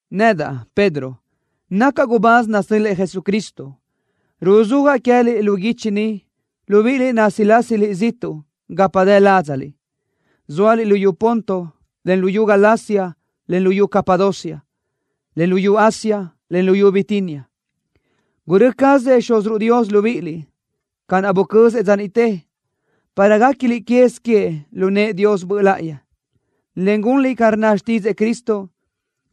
Nedaʼ, Pedro, nacaʼ gubáz nasö́l-lëʼë Jesucristo. Ruzúajaʼ queë́liʼ lu guichi ni, libíʼiliʼ násilasiliʼ ziʼtuʼ gapa dë ládzaliʼ, zóaliʼ luyú Ponto, en luyú Galacia, en luyú Capadocia, en luyú Asia, en luyú Bitinia. Gurö́ cazëʼ Xúziruʼ Dios libíʼiliʼ ca naʼ bucözëʼ dza niʼte, para guéquiliʼ quez queëʼ lu nëʼë Dios Böʼ Láʼayi, en gunliʼ ca rnna xtídzëʼë Cristo,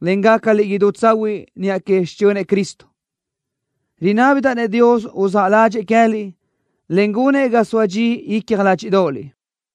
en gácaliʼ idú tsahuiʼ niʼa que xichönëʼ Cristo. Rinábidaʼ-nëʼ Dios uzáʼ ládxëʼë queë́liʼ, en gunëʼ ga soa dxi icja ládxiʼdoʼoliʼ.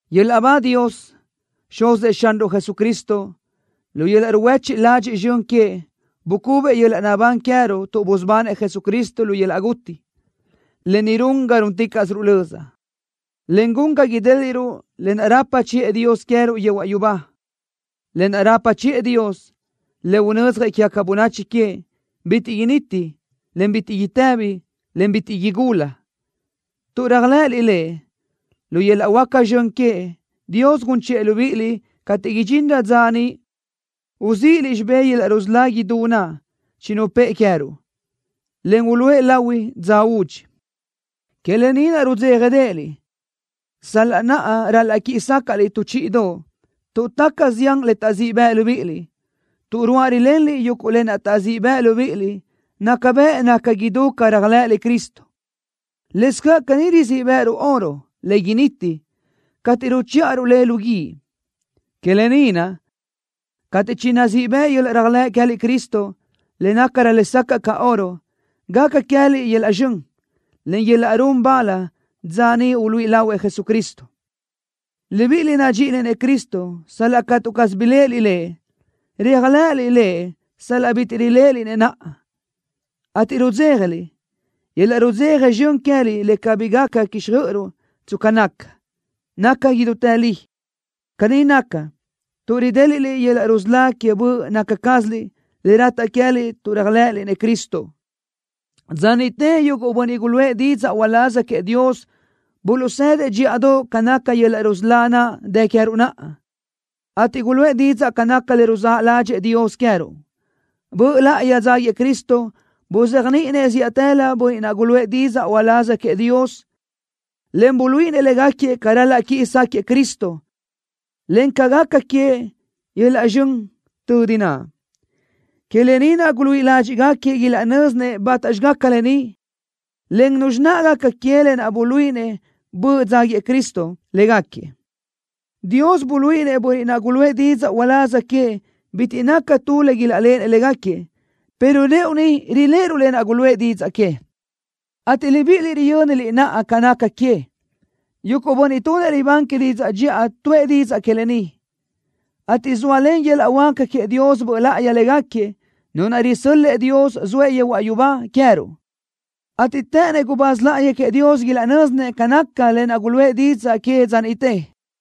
¡Yöl-laʼ ba Dios, Xuzëʼ Xanruʼ Jesucristo! ¡Lu yöl-laʼ ruhuéchiʼ ladxiʼ zxön queëʼ bucubëʼ yöl-laʼ naʼbán queë́ruʼ tuʼ busubanëʼ Jesucristo lu yöl-laʼ guti! ¡Lë ni run ga rúnticaʼsiruʼ löza, en gun ga idéliʼruʼ lë naʼ rapa chiʼë Dios queë́ruʼ yehuaʼ yubá! Lë naʼ rapa chiʼë Dios, le unödzjëʼ quégaca bönachi queëʼ, bitiʼ initi, en bitiʼ itëbi, en bitiʼ igula. Tuʼ réajlëʼëliʼ Lëʼ, lu yöl-laʼ huáca zxön queëʼ, Dios gun chiʼë libíʼiliʼ cateʼ idxinrö dza niʼ uzíʼiliʼ xibé yöl-laʼ rusölá idú naʼ chinupë́ʼë queë́ruʼ, en uluʼë lahui dza údxi. Que lë ni naʼ rudzéjadeʼeliʼ, sal-laʼ naʼa ral-laʼ quíʼi sácaʼliʼ tu chíʼidoʼ tuʼ taca zián le taʼzíʼ bëʼ libíʼiliʼ. Tuʼ ruáʼ rilenliʼ yuguʼ lë naʼ taʼzíʼ bëʼ libíʼiliʼ, naca bëʼ naca idú ca réajlëʼëliʼ Cristo. Lëscaʼ caní rizíʼ bë́ʼëruʼ oro, le initi, cateʼ ruchíʼaruʼ le lu guíʼ. Que lë ni naʼ, cateʼ chinazíʼ bëʼ yöl-laʼ réajlëʼ queë́liʼ Cristo, le nácarö lesacaʼ ca oro, gaca queë́liʼ yöl-laʼ zxön, en yöl-laʼ run bal dza niʼ uluíʼi lahuëʼ Jesucristo. Libíʼiliʼ nadxíʼiliʼ-nëʼ Cristo sal-laʼ catu caz biléʼeliʼ Lëʼ. Réajlëʼëliʼ Lëʼ sal-laʼ bitiʼ riléʼeliʼ-nëʼ naʼa, ateʼ rudzéjaliʼ. Yöl-laʼ rudzeja zxön queë́liʼ le cabí gaca quíxjöʼöruʼ tsca naca, naca idútë li. Caní naca, tuʼ ridéliʼliʼ yöl-laʼ rusölá que böʼ naca cázaliʼ, le rataʼ queë́liʼ tuʼ réajlëʼëliʼ-nëʼ Cristo. Dza niʼte yuguʼ bönniʼ guluʼë didzaʼ uláz queëʼ Dios buluʼsëdëʼ dxíʼadoʼ ca naca yöl-laʼ rusölá naʼ dë queë́ruʼ naʼa, ateʼ guluʼë didzaʼ ca naca le ruzáʼ ládxëʼë Dios queë́ruʼ. Böʼ Láʼayi dzáguiëʼ Cristo buzéajniʼinëʼ zíʼatëlö bönniʼ naʼ guluʼë didzaʼ uláz queëʼ Dios, en buluíʼinëʼ légaquiëʼ ca ral-laʼ quiʼi sáquëʼë Cristo, encaʼ ca gaca queëʼ yöl-laʼ zxön tödi naʼ. Que lë ni naʼ guluíʼi ládxiʼgaquiëʼ ilaʼnö́zinëʼ bátaxi gaca lë ni, en nuzxi naʼ gaca que lë naʼ buluíʼinëʼ Böʼ dzáguiëʼ Cristo légaquiëʼ. Dios buluíʼinëʼ bönniʼ naʼ guluʼë didzaʼ uláz queëʼ bitiʼ naca tu le ilaʼléʼenëʼ légaquiëʼ, pero rëʼu ni riléʼeruʼ lë naʼ guluʼë didzaʼ que, ateʼ libíʼiliʼ riyö́niliʼ naʼa ca naca que. Yuguʼ bönniʼ tunëʼ libán que didzaʼ dxiʼa tuʼë didzaʼ que lë ni, ateʼ zóalen yöl-laʼ huáca queëʼ Dios Böʼ Láʼayi légaquiëʼ, Nu naʼ risö́l-lëʼë Dios zoëʼ yehuaʼ yubá queë́ruʼ, ateʼ të́ʼënnëʼ gubáz láʼayi queëʼ Dios ilaʼnö́zinëʼ ca naca lë naʼ guluʼë didzaʼ que dza niʼte.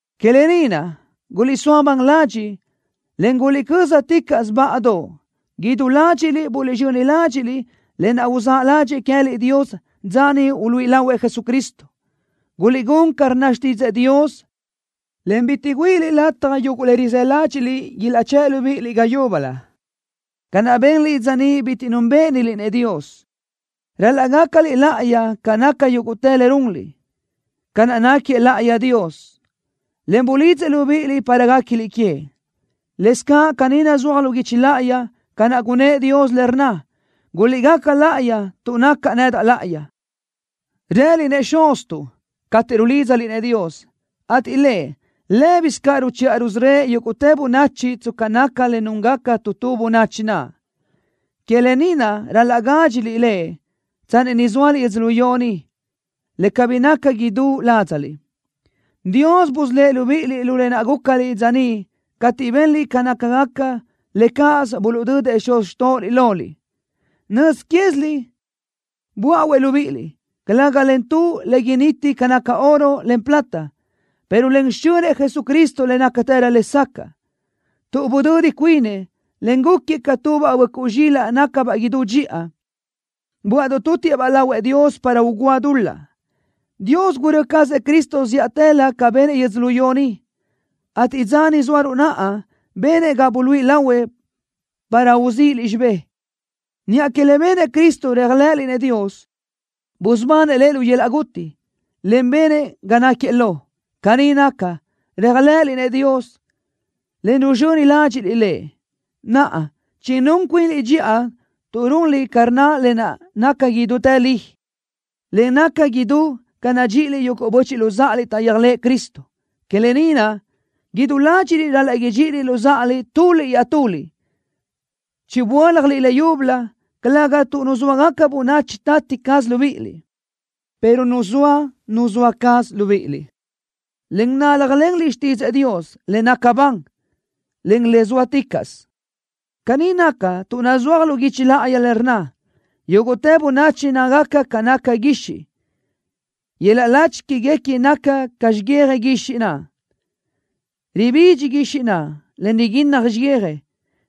Que lë ni naʼ, guliʼsóa ban ladxiʼ, en guliʼcö́zaticaʼsö báʼadoʼ. Idú ládxiʼliʼ buliʼzxöni ládxiʼliʼ lë naʼ uzáʼ ládxëʼë queë́liʼ Dios dza niʼ uluíʼi lahuëʼ Jesucristo. Guliʼgún ca rnna xtídzëʼë Dios, en bitiʼ güíʼiliʼ lataj yuguʼ le rizë́ ládxiʼliʼ ilaʼchë́ʼ libíʼiliʼ ga yúbölö, ca naʼ benliʼ dza niʼ bitiʼ núnbëʼëniliʼ-nëʼ Dios. Ral-laʼ gácaliʼ láʼayi ca naca yúguʼtë le runliʼ, ca naʼ náquiëʼ láʼayi Dios, en bulidzëʼ libíʼiliʼ para guéquiliʼ queëʼ. Lëscaʼ caní nazúaj lu guichi láʼayi, ca naʼ gunnë́ʼ Dios le rnna: “Guliʼgaca láʼayi, tuʼ nacaʼ nedaʼ láʼayi.” Rëliʼ-nëʼ: “Xuztuʼ” cateʼ rulídzaliʼ-nëʼ Dios, ateʼ Lëʼ, lë́bisö ca ruchiʼa rusörö́ëʼ yúguʼtë bönachi tsca naca le núngaca tu tu bönachi naʼ. Que lë ni naʼ ral-laʼ gádxiliʼ Lëʼ tsanni ni zóaliʼ yödzölió ni, le cabí naca idú ládzaliʼ. Dios busölë́ʼ libíʼiliʼ lu lë naʼ gúcaliʼ dza niʼ cateʼ benliʼ ca nácagaca le cáʼasö buluʼdödëʼ xuz xtóʼoliʼ loliʼ. Nöz quéziliʼ böáʼuëʼ libíʼiliʼ, calëga len tu le initi ca naca oro, en plata, pero len xichönëʼ Jesucristo le nácatërö lesacaʼ, tuʼ budödi cuinëʼ, en gúquiëʼ ca tubaʼ böʼcuʼ zxilaʼ nácabaʼ idú dxiʼa, böaʼdoʼ tutiëʼ-baʼ lahuëʼ Dios para ugúa dul-laʼ. Dios gurö́ cazëʼ Cristo zíʼatëlö ca benëʼ yödzölió ni, ateʼ dza ni zóaruʼ naʼa benëʼ ga buluíʼi lahuëʼ para uzíʼiliʼ xibë́ʼ. Niʼa que le benëʼ Cristo réajlëʼëliʼ-nëʼ Dios, busubanëʼ Lëʼ lu yöl-laʼ guti, en benëʼ ga náquiëʼ lo. Caní naca, réajlëʼëliʼ-nëʼ Dios, en ruzxöni ládxiʼliʼ Lëʼ. Naʼa, chinún cuinliʼ dxiʼa tuʼ runliʼ ca rnna le naca idútë li, en naca idú ca nadxíʼiliʼ yuguʼ böchiʼ luzáʼaliʼ taʼyéajlëʼë Cristo. Que lë ni naʼ, idú ládxiʼliʼ ral-laʼ idxíʼiliʼ luzáʼaliʼ tuliʼ iaʼtuliʼ. Chiböáljaliʼ leyúbölö, calëga tuʼ nuzóagaca bönachi tati caz libíʼiliʼ, pero nuzóa Nu zoa caz libíʼiliʼ, en náljalenliʼ xtídzëʼë Dios, le naca ban, en le zóaticaʼsö. Caní naca, tuʼ nazúaj lu guichi láʼayi le rnna: Yúguʼtë bönachi nácagaca ca naca guixiʼ. Yöl-laʼ lachi quéguequi naca ca xiyija guixiʼ naʼ. Ribidxi guixiʼ naʼ, en riguinnaj xiyija,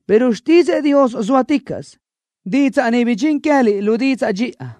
pero xtídzëʼë Dios zóaticaʼsö. Didzaʼ ni bidxín queë́liʼ lu didzaʼ dxiʼa.